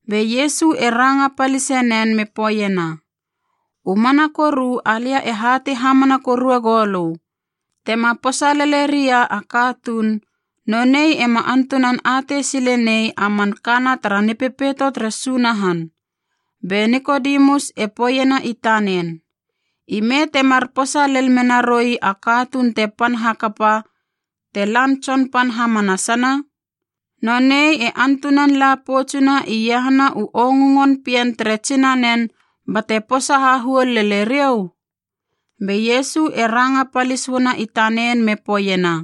Be Iesu e ranga palise nen me poeiena, “U mana koru alia e hatei hamana korue goulö, tema posa lele ria a katuun, nonei ema antunan atei sile nei a man kana tara Nipepeito tere Sunahan.” Be Nikodemus e poeiena i tanen, “Ime temar posa lel mena roi a katuun te pan hakapa te lan tsonpan hamanasana? Nonei e antunan la poutsuna iahana u ongungon pien tere tsinanen bate posa hahuol lele riou?” Be Iesu e ranga palis uana i tanen me poeiena,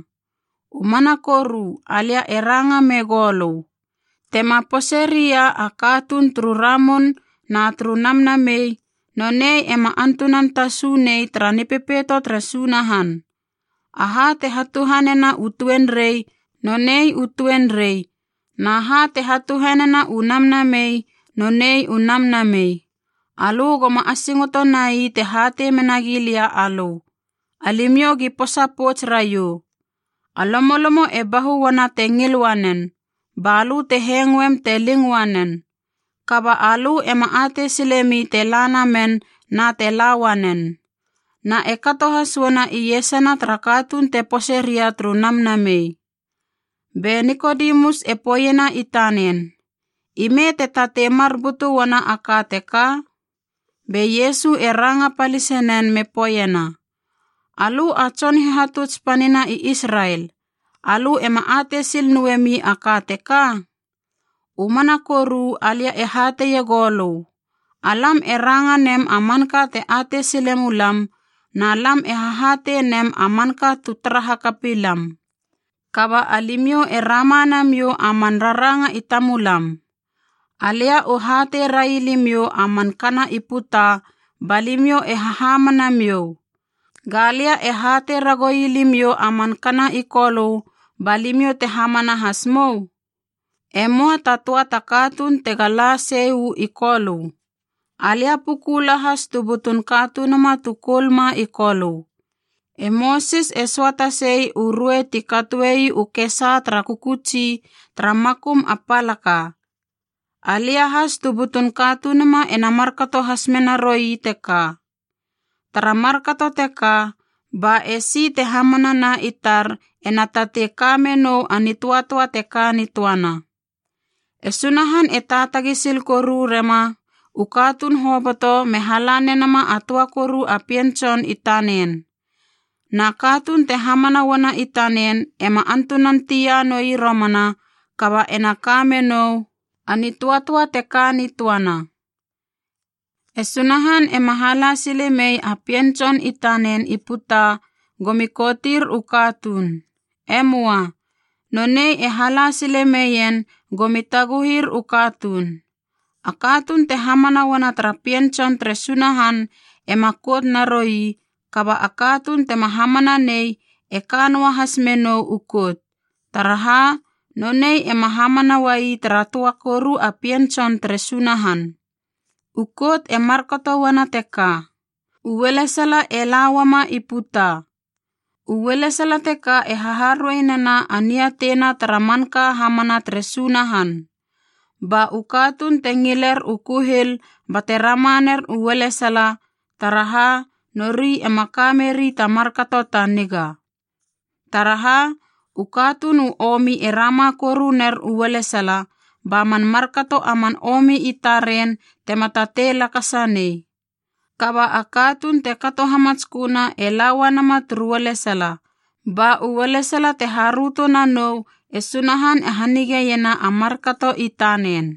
“U mana koru alia e ranga mei goulö, tema pose ria a katuun turu ramun na turu namnamei, nonei ema antunan tasu nei tara Nipepeito tere Sunahan. Aha te hatuhanena u tuenrei, nonei u tuenrei, na ha te hatuhanena u namnamei, nonei u namnamei. Alö go ma asingoto nai te hatei menagi lia alö, ‘Alimiou gi posa pouts raiou.’ A lomolomo e bahu uana te ngil uanen, balö te hengoem te ling uanen. Kaba alö ema atei silemi te la namen na te la uanen. Na e kato has uana iesana tara katuun te pose ria turu Namnamei.” Be Nikodemus e poeiena i tanen, “Ime te tatei mar butu uana a ka teka?” Be Iesu e ranga palisenen me poeiena, “Alö a tson hihatuts panina i Israel, alö ema atei sil noemi a ka teka? U mana koru alia e hateie goulö, alam e ranga nem a manka te atei sile mulam na lam e hahatei nem a manka tu tara hakapi lam, kaba alimiou e rama namiou a man raranga i tamulam. Alia u hatei rai limiou a man kana i puta ba limiou e hahamana miou. Galia e hatei ragoui limiou a man kana i Kolö ba limiou te hamana has mou? E möa ta töa ta katuun tega la sei uu i Kolö. Alia puku lahas tu butun Katunuma tu koulma i Kolö. E Mosis e söata sei u ruei ti katoei u kesa tara kökötsi tara makum a palaka, alia has tu butun Katunuma ena markato has menaroi teka. Tara markato teka ba esi te hamana na i tar ena tatei ka menou a nitöatöa te ka nitöana.” E Sunahan e taatagi sil koru rema u katuun hoboto me hala nenama a töa koru a Pien Tson i tanen. Na katuun te hamana uana i tanen ema antunan tia noi romana kaba ena ka menou a nitöatöa te ka nitöana. E Sunahan ema hala sile mei a Pien Tson i tanen i puta gomi koutir u katuun. E möa. Nonei e hala sile meien gomi taguhir u katuun. A katuun te hamana uana tara Pien Tson tere Sunahan ema kout naroi kaba a katuun tema hamana nei e ka noa has mena u kout, taraha nonei ema hamana uai tara töa koru a Pien Tson tere Sunahan. U kout e markato uana teka: u ualesala e la uama i puta. U ualesala teka e haharuei nena a niateina tara manka hamana tere Sunahan. Ba u katuun te ngiler u kuhil bate rama ner u ualesala, taraha nori ema ka meri ta markato ta niga. Taraha, u katuun u omi e rama koru ner u ualesala, ba man markato a man omi i taren tema tatei lakasa nei. Kaba a katuun te kato hamatsköna e laua nama turu ualesala, ba u ualesala te haröto nanou e Sunahan e hanigeiena a markato i tanen.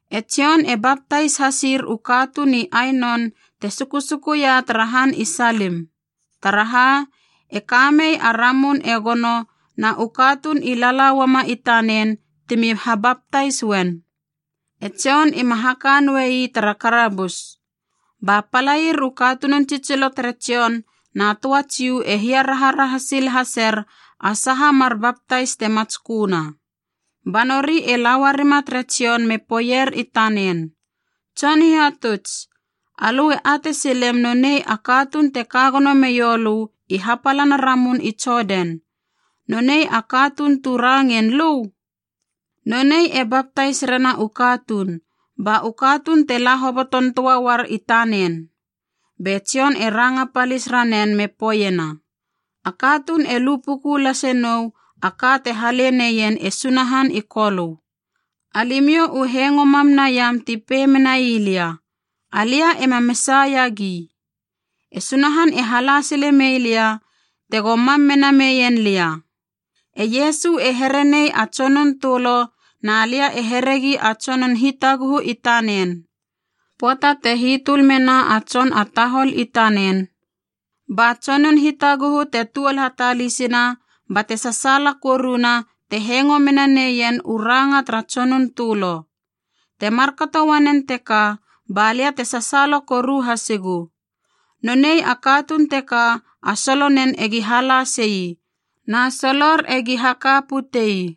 E Jon e baptais hasir u katuun i Ainon te sukusukuia tara han i Salim. Taraha, e kamei a ramun e gono na u katuun i lala uama i tanen timi habaptais uen. E Jon ima haka noei tara karabus. Ba palair u katunun tsitsiloa tere Jon na töa Jiu e hiaraharaha sil haser a saha mar baptais te matsköna. Ba nori e lauarima tere Jon me poeier i tanen, “Tson Hihatuts, alö e atei silem nonei a katuun te ka gono meiou lö i hapalana ramun i Jodan, nonei a katuun tu rangein lö? Nonei e baptais rena u katuun, ba u katuun te la hoboton töa uar i tanen!” Be Jon e ranga palis ranen me poeiena, “A katuun e lu puku lase nou a ka te hale neien e Sunahan i Kolö. Alimiou u hengo mam naiam ti pei menai lia, ‘Alia ema Mesaia gi. E Sunahan e hala sile meilia tego mam mena meien lia.’ E Iesu e here nei a tsonun tölo na lia e heregi a tsonun hitaguhu i tanen. Pöata te hitöl mena a tson a tahol i tanen, ba tsonun hitaguhu te tuol hatalisina bate sasaala koruna te hengo mena neien u ranga tara tsonun tölo. Te markato uanen teka ba lia te sasaala koru hasigu. Nonei a katuun teka a solo nen egi hala sei, na solor egi haka putei.”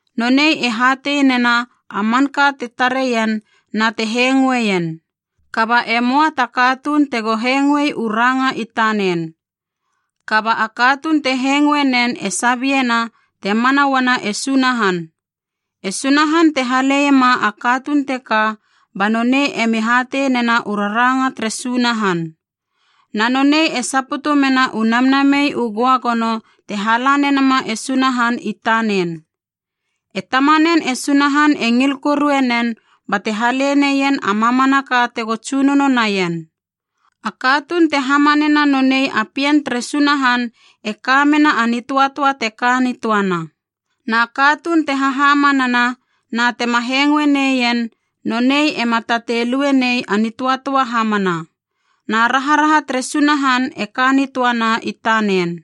Nonei e hatei nena a manka te tare ien na te hengoeien. Kaba e möa ta katuun tego hengoe u ranga i tanen. Kaba a katuun te hengoe nen e sabiena te mana uana e Sunahan. E Sunahan te haleiema a katuun teka ba nonei emi hatei nena u raranga tere Sunahan. Na nonei e saputu mena u Namnamei u Göagono te hala nenama e Sunahan i tanen. E tamanen e Sunahan e ngil korue nen bate hale neien a mamanaka tego tsunono naien. A katuun te hamanena nonei a Pien tere Sunahan e ka mena a nitöatöa te ka nitöana. Na katuun te hahamanana na tema hengoe neien, nonei ema tatei lue nei a nitöatöa hamana, na raharaha tere Sunahan e ka nitöana i tanen.